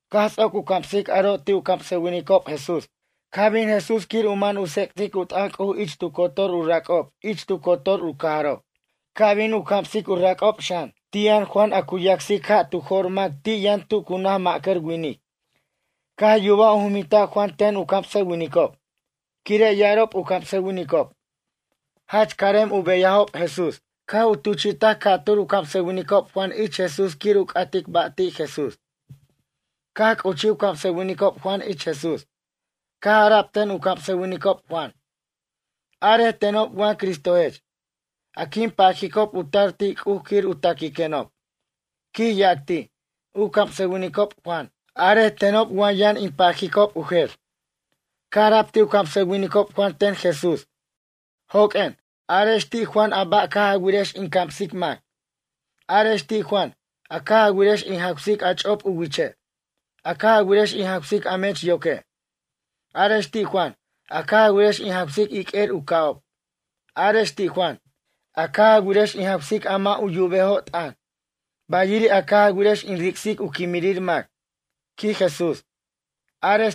Caj ts'oc u camsic aro' ti' u camsʌwinicob Jesús. Caj bin Jesús quir u man u tsec'tic u t'ʌn C'uj ich tu cotor u rac'ob ich tu cotor u cajarob, ca' bin u camsic u rac'ob xan. Ti' yʌn Juan a cu yacsic ja' tu jo'r mac ti' yʌn tu cu naj ma'cʌr winic. Caj yubaj u juminta' Juan ten u camsʌwinicob. Quire' ya'arob u camsʌwinicob: “Jach carem u beyajob Jesús.” Caj u tuchi'taj ca'tur u camsʌwinicob Juan ich Jesús quir u c'atic ba' ti' Jesús. Caj c'uch u camsʌwinicob Juan ich Jesús. Caj ara'b ten u camsʌwinicob Juan: ―Arej tenob wa Cristojech, a quin pajicob u tar ti' C'uj quir u taquiquenob ―quij yac ti', u camsʌwinicob Juan―. Arej tenob wa yʌn in pajicob u jer? Caj ara'b ti' u camsʌwinicob Juan ten Jesús: ―Joq'uen, arex ti' Juan a ba' caj a wirex in camsic mac. Arex ti' Juan, a caj a wirex in jawsic a ch'op u wiche'. A caj a wirex in jawsic a mech yoque'. Arex ti' Juan, a caj a wirex in jawsic iq'uer u ca'ob. Arex ti' Juan, a caj a wirex in jawsic a mʌ' u yubejo' t'ʌn. Bayiri' a caj a wirex in ric'sic u quimirir mac ―quij Jesús―. Arex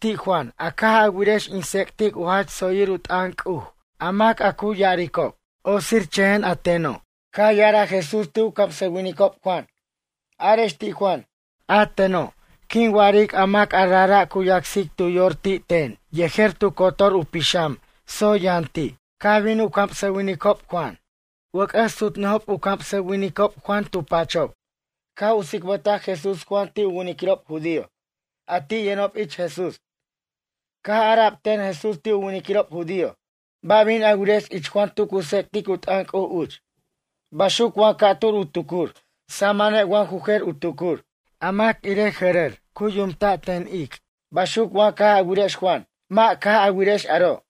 ti' Juan, a caj a wirex in tsec'tic u jach tsoyir u t'ʌn C'uj a mac a cu ya'aricob: “Otsirchʌjen a teno'.” Caj ya'araj Jesús ti' u camsʌwinicob Juan: ―Arex ti' Juan. A teno', quin wa'aric a mac a rajra' cu yacsic tu yor ti' ten yejer tu cotor u pixam tsoy yʌn ti'. Caj bin u camsʌwinicob Juan. Wʌc'ʌs sutnʌjob u camsʌwinicob Juan tu pachob. Caj u tsicbʌtaj Jesús Juan ti' u winiquirob judío, a ti' yʌnob ich Jesús. Caj ara'b ten Jesús ti' u winiquirob judío: ―Ba' bin a wirex ich Juan tu cu tsec'tic u t'ʌn C'uj uch. Baxuc wa ca'tur u tucur? Samane' wa ju jer u tucur. A mac irej jʌrʌr cu yumta' ten ic'? Baxuc wa caj a wirex Juan? Mʌ' caj a wirex aro'.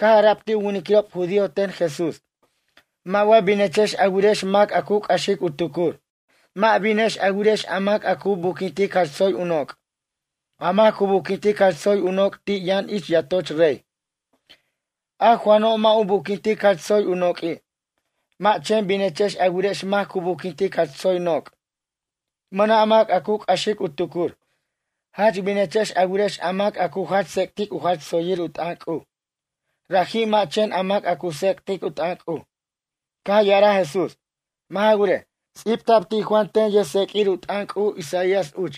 Caj ara'b ti' u winiquirob judío ten Jesús: ―Mʌ' wa binechex a wirex mac a cu c'axic u tucur. Mʌ' binex a wirex a mac a cu buquintic jach tsoy u noc'. A mac cu buquintic jach tsoy u noc' ti' yʌn ich yatoch rey. A Juano' mʌ' u buquintic jach tsoy u noq'ui'. Mʌ' chen binechex a wirex mac cu buquintic jach tsoy noc'. Mʌna' mac a cu c'axic u tucur. Jach binechex a wirex a mac a cu jach tsec'tic u jach tsoyir u t'ʌn C'uj. Raji' mʌ' chen a mac a cu tsec'tic u t'ʌn C'uj. Caj ya'araj Jesús: ―Mʌ' ja wirej, ts'ibta'b ti' Juan ten yʌjtseq'uir u t'ʌn C'uj Isaías uch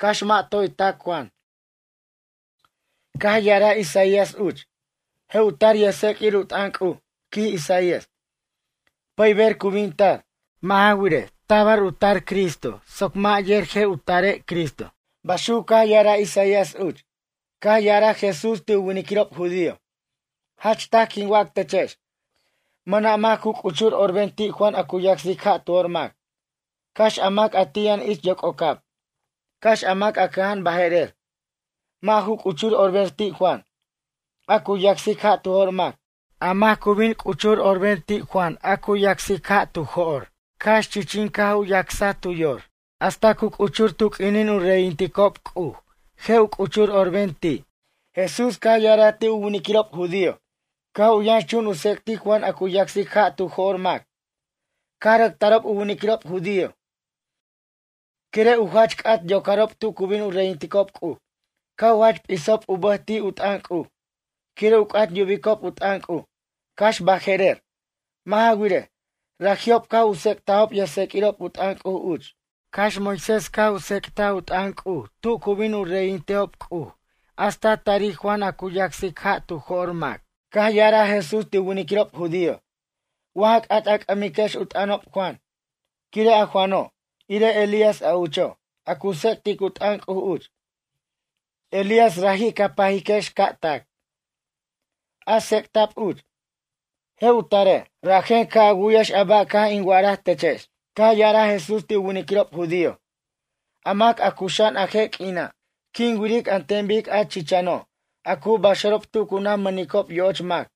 cax mʌ' toy tac Juan. Caj ya'araj Isaías uch: Je' u tar yʌjtseq'uir u t'ʌn C'uj, quij Isaías. Pʌyber cu bin tar. Mʌ' ja wirej, tabar u tar Cristo soc mac yer je' u tare' Cristo. Baxuc caj ya'araj Isaías uch. Caj ya'araj Jesús ti' u winiquirob judío: ―Jach taj quin wac techex. Mʌna' mac cu c'uchur orben ti' Juan a cu yacsic ja' tu jo'r mac. Cax a mac a ti' yʌn ich yoc'ocab. Cax a mac cʌja'an baje'rer. Mʌ' ju c'uchur orben ti' Juan, a cu yacsic ja' tu jo'r mac. A mac cu bin c'uchur orben ti' Juan a cu yacsic ja' tu jo'r cax chichin caj u yacsaj tu yor. Hasta cu c'uchur tu q'uinin u reyinticob C'uj je' u c'uchur orben ti'. Jesús caj ya'araj ti' u winiquirob judío: ―Caj u yʌnxchun u tsec'tic Juan a cu yacsic ja' tu jo'r mac. Caj rʌc tarob u winiquirob judío quire' u jach c'at yocarob tu cu bin u reyintejob C'uj. Caj u jach p'isob u bʌj ti' u t'ʌn C'uj. Quire' u c'at yubicob u t'ʌn C'uj cax baje'rer. Mʌ' ja wirej, raji'ob caj u tsec'tajob yʌjtseq'uirob u t'ʌn C'uj uch, cax Moisés caj u tsec'taj u t'ʌn C'uj tu cu bin u reyintejob C'uj hasta tari Juan a cu yacsic ja' tu jo'r mac. Caj ya'araj Jesús ti' u winiquirob judío: ―Wa ja c'at a c'ʌmiquex u t'ʌnob Juan. Quire' a Juano', irej Elías a ucho', a cu tsec'tic u t'ʌn C'uj uch. Eliás raji' ca pajiquex ca' tac. A tsec'ta'b uch: “Je' u tare'.” Rajen ca' a wu'yex a ba' caj in wa'araj techex. Caj ya'araj Jesús ti' u winiquirob judío: ―A mac a cuxa'an a je' q'uina', quin wiric an ten bic a chichano', a cu baxarob tu cu naj mʌnicob yo'och mac.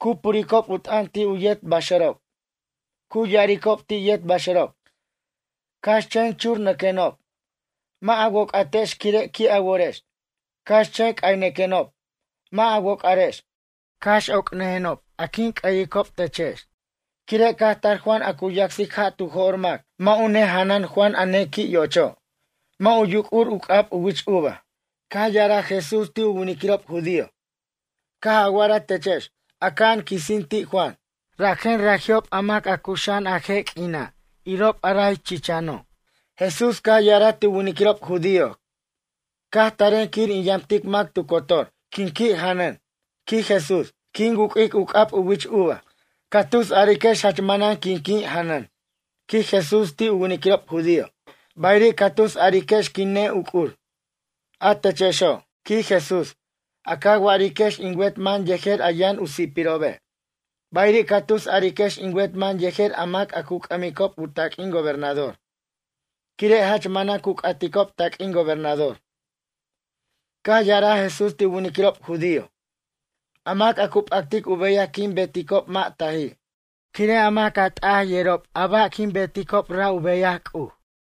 Cu puricob u t'ʌn ti' u yet baxarob. Cu ya'aricob ti' yet baxʌrob: “Cax chen churnʌquenob, mʌ' a woc'atex quire' qui' a worex. Cax chen c'aynʌquenob, mʌ' a woc'arex, cax oc'nʌjenob a quin c'ʌyicob techex.” Quire' caj tar Juan a cu yacsic ja' tu jo'r mac. Mʌ' u nejanan Juan a nequi' yo'ocho'. Mʌ' u yuc'ur u c'ab u wich uva. Caj ya'araj Jesús ti' u winiquirob judío: ―Caj a wa'araj techex: “Aca'an quisin ti' Juan.” Rajen raji'ob a mac a cuxa'an a je' q'uina' irob a ray chichano'. Jesús caj ya'araj ti' u winiquirob judío: ―Caj taren quir in yamtic mac tu cotor. Quin qui' janʌn ―quij Jesús―. Quin wu'q'uic u c'ab u wich uva. Ca tus a'ariquex jach manan qui' quin janʌn ―quij Jesús ti' u winiquirob judío―. Bayiri' ca tus a'ariquex quin ne'uc'ur. A techexo' ―quij Jesús―, a ca wa'ariquex in wet man yejer a yʌn u si'pirobe'. Bayiri' ca tus a'ariquex in wet man yejer a mac a cu c'ʌmicob u taq'uin gobernador. Quire' jach manan cu c'aticob taq'uin gobernador. Caj ya'araj Jesús ti' u winiquirob judío: ―A mac a cu p'actic u beyaj quin beticob mʌ' t'aji'. Quire' a mac a t'aji' yerob a ba' quin beticob ra' u beyaj C'uj.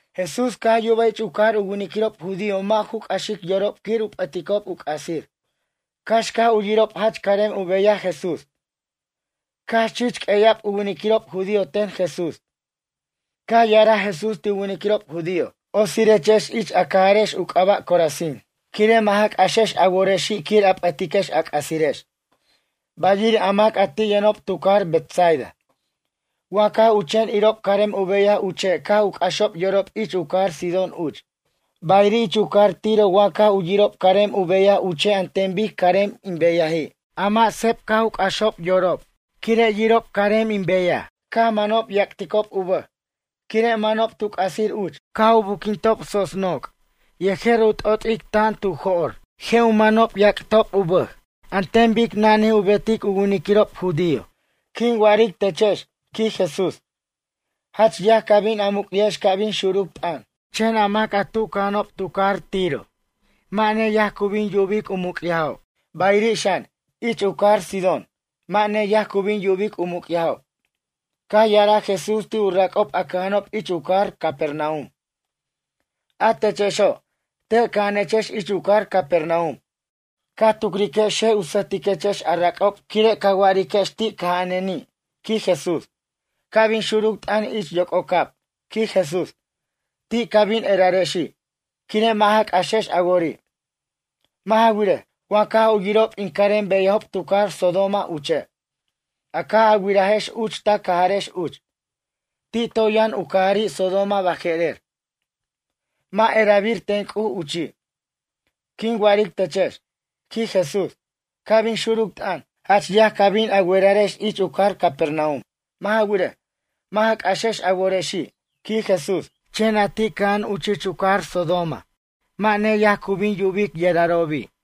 Jesús caj yubaj ich u cajar u winiquirob judío mʌ' ju c'axic yorob quir u p'ʌticob u c'asir, cax caj u yirob jach carem u beyaj Jesús. Caj chich q'ueya'b u winiquirob judío ten Jesús. Caj ya'araj Jesús ti' u winiquirob judío: ―Otsirechex ich a cajarex u c'aba' Corazín, quire' mʌ' ja c'axex a worexi' quir a p'ʌtiquex a c'asirex. Bayiri' a mac a ti' yʌnob tu cajar Betsaida. Wa caj u chen irob carem u beyaj uche' caj u c'axob yorob ich u cajar Sidón uch. Bayiri' ich u cajar Tiro wa caj u yirob carem u beyaj uche' an ten bic carem in beyaji'. A mʌ' seb caj u c'axob yorob quire' yirob carem in beyaj. Caj manob yac'ticob u bʌj, quire' manob tu c'asir uch. Caj u buquintob tsots noc' yejer u t'ot'ic tan tu jo'r je' u manob yac'tob u bʌj an ten bic nani u betic u winiquirob judío. Quin wa'aric techex ―quij Jesús―. Jach yaj ca bin a muc'yajex ca' bin xuruc t'ʌn. Chen a mac tu cʌja'anob tu cajar Tiro mʌ' neyaj cu bin yubic u muc'yajob. Bayiri' xan, ich u cajar Sidón. Mʌ' neyaj cu bin yubic u muc'yajob. Caj ya'araj Jesús ti' u rac'ob a cʌja'anob ich u cajar Capernaum: ―A techexo', te' cʌja'anechex ich u cajar Capernaum. Ca tucriquex je' u sʌjtiquechex a rac'ob quire' ca wiriquex ti' cʌja'aneni' ―quij Jesús―. Ca' bin xuruc t'ʌn ich yoc'ocab ―quij Jesús―. Ti' ca bin erarexi', quire' mʌ' ja c'axex a wori'. Mʌ' ja wirej, wa caj u yirob in carem beyajob tu cajar Sodoma uche', a caj a wirajex uch ta cajarex uch, ti' toy yʌn u cajari' Sodoma baje'rer. Mʌ' erabir ten C'uj uchi'. Quin wa'aric techex ―quij Jesús―. Ca' bin xuruc t'ʌn, jach yaj ca bin a werarex ich u cajar Capernaum. Mʌ' ja wirej, mʌ' ja c'axex a worexi' ―quij Jesús―. Chen a ti' cʌja'an uch ich u cajar Sodoma mʌ' neyaj cu bin yubic yerarobi'.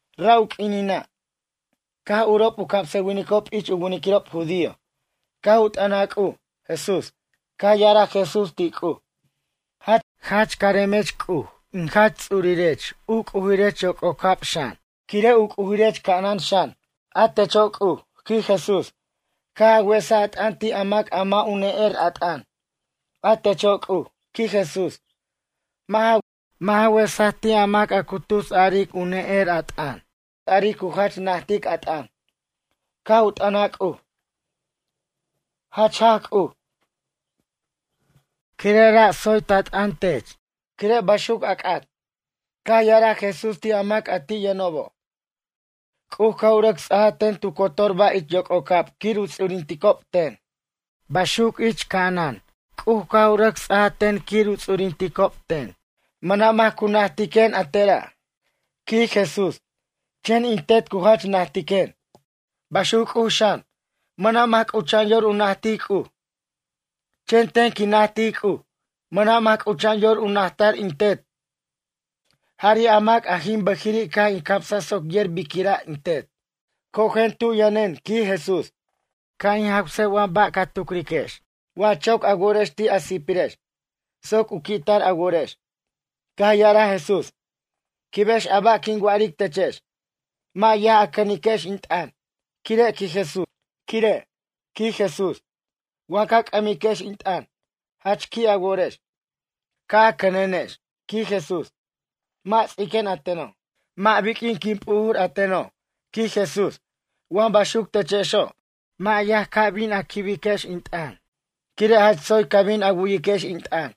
Ra' u q'uinina', caj urob u camsʌwinicob ich u winiquirob judío, caj u t'ʌnaj C'uj, Jesús. Caj ya'araj Jesús ti' C'uj: ―Jach caremech C'uj in Jach Ts'urech u C'ujirech yoc'ocab xan, quire' u C'ujirech ca'anan xan. A techo' C'uj ―quij Jesús―, caj a wesaj a t'ʌn ti' a mac a mʌ' u ne'er a t'ʌn. A techo' C'uj ―quij Jesús―, mʌ' ja wesaj ti' a mac a cu tus a'aric u ne'er a t'ʌn. A cu tus a'aric cu jach najtic a t'ʌn. Caj u t'ʌnaj C'uj: ―Jach jaj C'uj, quire' ra' tsoy ta t'ʌn tech, quire' baxuc a c'at. Caj ya'araj Jesús ti' a mac a ti' yʌnobo': ―C'uj caj u rʌc ts'aj ten tu cotor ba' ich yoc'ocab quir u ts'urinticob ten. Baxuc ich ca'anan C'uj caj u rʌc ts'aj ten quir u ts'urinticob ten. Mʌna' mac cu najtiquen a tera' ―quij Jesús―. Chen in Tet cu jach najtiquen. Baxuc C'uj xan, mʌna' mac c'ucha'an yor u najtic C'uj, chen ten quin najtic C'uj. Mʌna' mac c'ucha'an yor u najtar in Tet, jari' a mac a jin bʌjiri' caj in camsaj soc yer biquira' in Tet. ’Cojen tu yʌnen ―quij Jesús―, ca' in jawsej wa ba' ca tucriquex, wa choc a worex ti' a si'pirex, soc u qui'tar a worex. Caj ya'araj Jesús: ―Quibex a ba' quin wa'aric techex. Mʌ' yaj a cʌniquex in t'ʌn. Quire' ―quij Jesús―, wa ca c'ʌmiquex in t'ʌn, jach qui' a worex. Ca' a cʌnenex ―quij Jesús―. Mʌ' ts'iquen a teno', mʌ' biq'uin quin p'ujur a teno' ―quij Jesús―. Wa baxuc techexo', mʌ' yaj ca bin quibiquex in t'ʌn, quire' jach tsoy ca bin a wu'yiquex in t'ʌn.